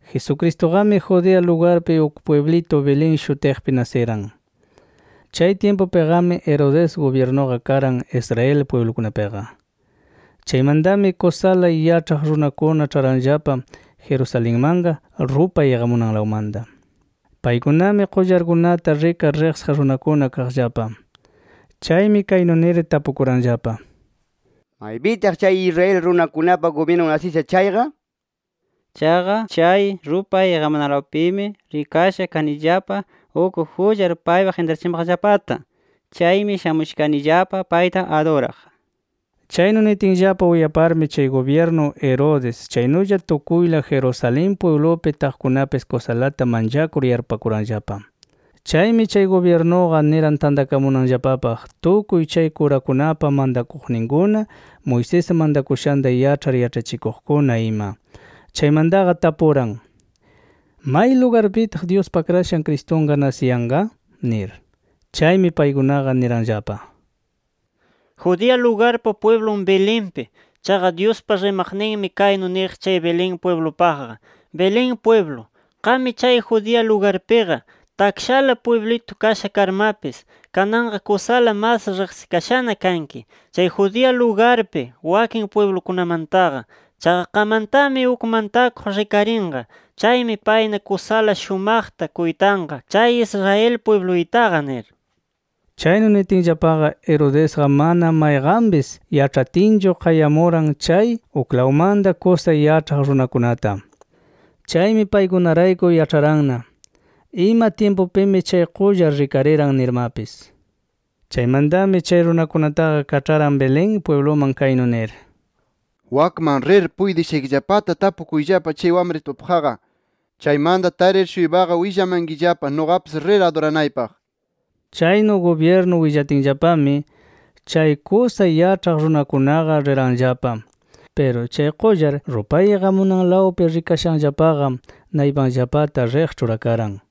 Jesucristuqami Judea lugarpi uk pwiblitu Belén shutiqpi nasiran. Chay tyimpupiqami Herodes gubyirnuqa karan Israel pwiblukunapiqa. Chaymantami kusala yaĉhaq runakuna ĉharanllapa Jerusalenmanqa rupay iqamunanlawmanta. Paykunami qullarkunata rikar riqsiq runakuna kaqllapa. Chaymi kaynu nir tapukuranllapa: “¿Maypitaq chay Israel runakunapa gubyirnun nasisha chayqa? Chaqa chay rupay iqamunanlawpimi rikasha kanillapa uk qullar paypaq intrachimaqllapata. Chaymi shamusha kanillapa payta aduraq”. Chaynu nitinllapa uyaparmi chay gubyirnu Herodes chaynulla tukuyla Jerusalén pwiblupi taqkunapis kusalata manchakur yarpupakuranllapa. Chaymi chay gubyirnuqa niran tantakamunanllapapaq tukuy chay kurakunapa mantakuqninkuna, Moisés mantakushanta yaĉhar yaĉhachikuqkuna ima. Chaymantaqa tapuran: —¿May lugarpitaq Dyuspa Akrashan Cristunqa nasiyanqa? nir. Chaymi paykunaqa niranllapa: —Judea lugarpa pwiblun Belenpi. Chaqa Dyuspa rimaqninmi kaynu niq Belén pwiblupaqqa: ‘Belén pwiblu, qammi chay Judea lugarpiqa, takshala pwiblitu kasha karmapis, kananqa kusala mas riqsikashana kanki chay Judea lugarpi wakin pwiblukunamantaqa. Chaqa qammantami uk mantakuq rikarinqa. Chaymi payna kusala shumaqta kuytanqa chay Israel pwibluytaqa’ nir. Chaynu nitinllapaqa, Herodesqa mana mayqanpis yaĉhatinchu, qayamuran chay uklawmanta kusa yaĉhaq runakunata. Chaymi paykunarayku yaĉharanna ima tyimpupimi chay qullar rikariran nirmapis. Chaymantami chay runakunataqa kaĉharan Belén pwibluman kaynu nir: —Wakman rir puytishaykillapata tapukuyllapa chay wamritupaqqa. Chaymanta tarir-shuypaqa willamankillapa, nuqapis rir aduranaypaq nir. Chaynu gubyirnu willatinllapami, chay kusa yaĉhaq runakunaqa riranllapa. Piru chay qullar rupay iqamunanlawpi rikashanllapaqa, naypanllapata riq ĉhurakaran.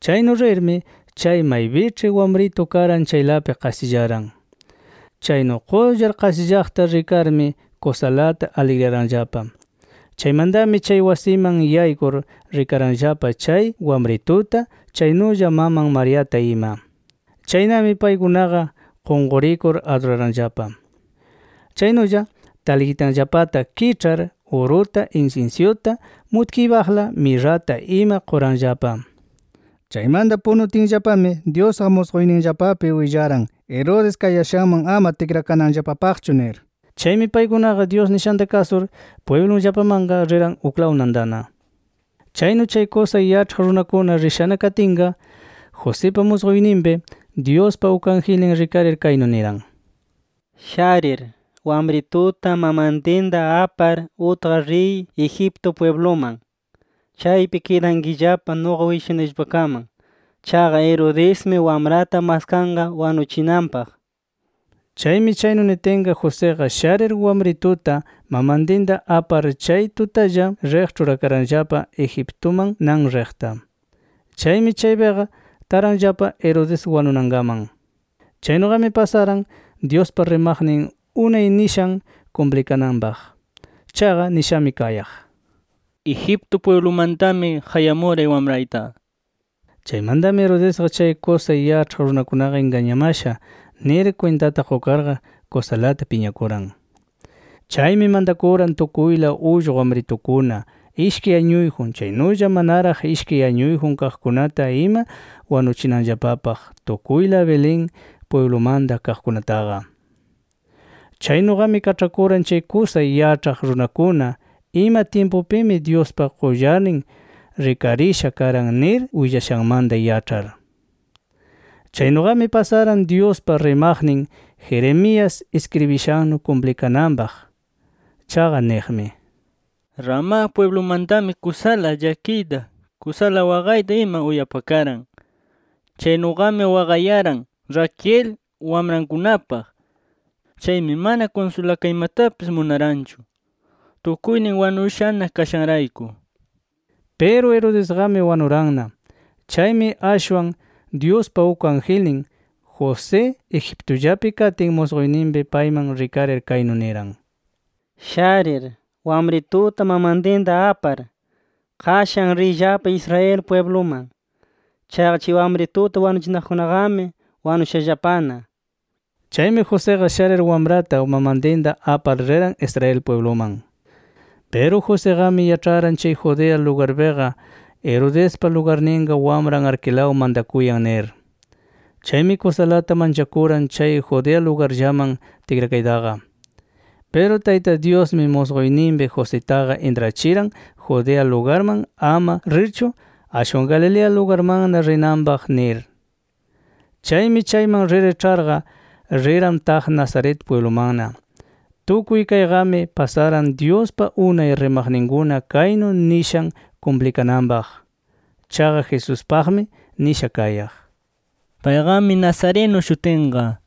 Chaynu rirmi chay maypiĉhi wamritu karan chaylapi qasillaran. Chaynu qullar qasillaqta rikarmi, kusalata aligriyaranllapa. Chaymantami chay wasiman yaykur, rikaranllapa chay wamrituta chaynulla maman Mariata ima. Chaynami paykunaqa qunqurikur aduraranllapa. Chaynulla talqitanllapata kiĉhar, uruta, insinsyuta, mutkiypaqla mirrata ima quranllapa. Chaymanta punutinllapami Dyusqa musquyninllapapi willaran Herodes kayashanman ama tikrakananllapapaqchu nir. Chaymi paykunaqa Dyus nishanta kasur pwiblunllapamanqa riran uklaw nantana. Chaynu chay kusa yaĉhaq runakuna rishana katinqa, Josipa musquyninpi Dyuspa uk angelnin rikarir kaynu niran: “Sharir, wamrituta mamantinta apar utqar riy Egipto pwibluman. Chaypi kidankillapa nuqa willashunayllapakaman. Chaqa Herodesmi wamrata maskanqa wanuchinanpaq” nir. Chaymi chaynu nitinqa Josiqa sharir, wamrituta mamantinta apar, chay tutalla riq ĉhurakaranllapa Egiptuman nan riqta. Chaymi chaypiqa taranllapa Herodes wanunankaman. Chaynuqami pasaran Dyuspa rimaqnin unay nishan kumplikananpaq. Chaqa nishami kayaq: “Egipto pwiblumantami qayamuray wamrayta” nir. Chaymantami Herodesqa chay kusa yaĉhaq runakunaqa ingañamasha nir kwintata qukarqa, kusalata piñakuran. Chaymi mantakuran tukuyla ullqu wamritukuna ishkay añuyjun, chaynulla manaraq ishkay añuyjun kaqkunata ima wanuchinanllapapaq tukuyla Belén pwiblumanta kaqkunataqa. Chaynuqami kaĉhakuran chay kusa yaĉhaq runakuna ima tyimpupimi Dyuspa qullarnin rikarisha karan nir willashanmanta yaĉhar. Chaynuqami pasaran Dyuspa rimaqnin Jeremías iskribishannu kumplikananpaq. Chaqa niqmi: “Ramá pwiblumantami kusala llakiyta, kusala waqayta ima uyapakaran. Chaynuqami waqayaran Raquel, wamrankunapaq. Chaymi mana kunsulakaymatapis munaranchu, tukuynin wanushana kashanrayku” nir. Piru Herodesqami wanuranna. Chaymi ashwan Dyuspa uk angelnin, José Egiptullapi katin, musquyninpi payman rikarir kaynu niran: “Sharir, wamrituta mamantinta apar, qashan riyllapa Israel pwibluman. Chaqa chay wamrituta wanuchinaqkunaqami wanushallapana” nir. Chaymi Josiqa sharir wamrata mamantinta apar riran Israel pwibluman. Piru Josiqami yaĉharan chay Judea lugarpiqa Herodespa lugarninqa wamran Arquelao mantakuyan nir. Chaymi kusalata manchakuran chay Judea lugarllaman tikrakaytaqa. Piru Tayta Dyusmi musquyninpi Jositaqa intrachiran Judea lugarman ama rirchu, ashwan Galilea lugarmanna rinanpaq nir. Chaymi chayman rir ĉharqa, riran taq Nazaret pwiblumanna. Tukuy kayqami pasaran Dyuspa unay rimaqninkuna kaynu nishan kumplikananpaq. Chaqa Jesuspaqmi nisha kayaq: “Payqami nazareno shutinqa” nir.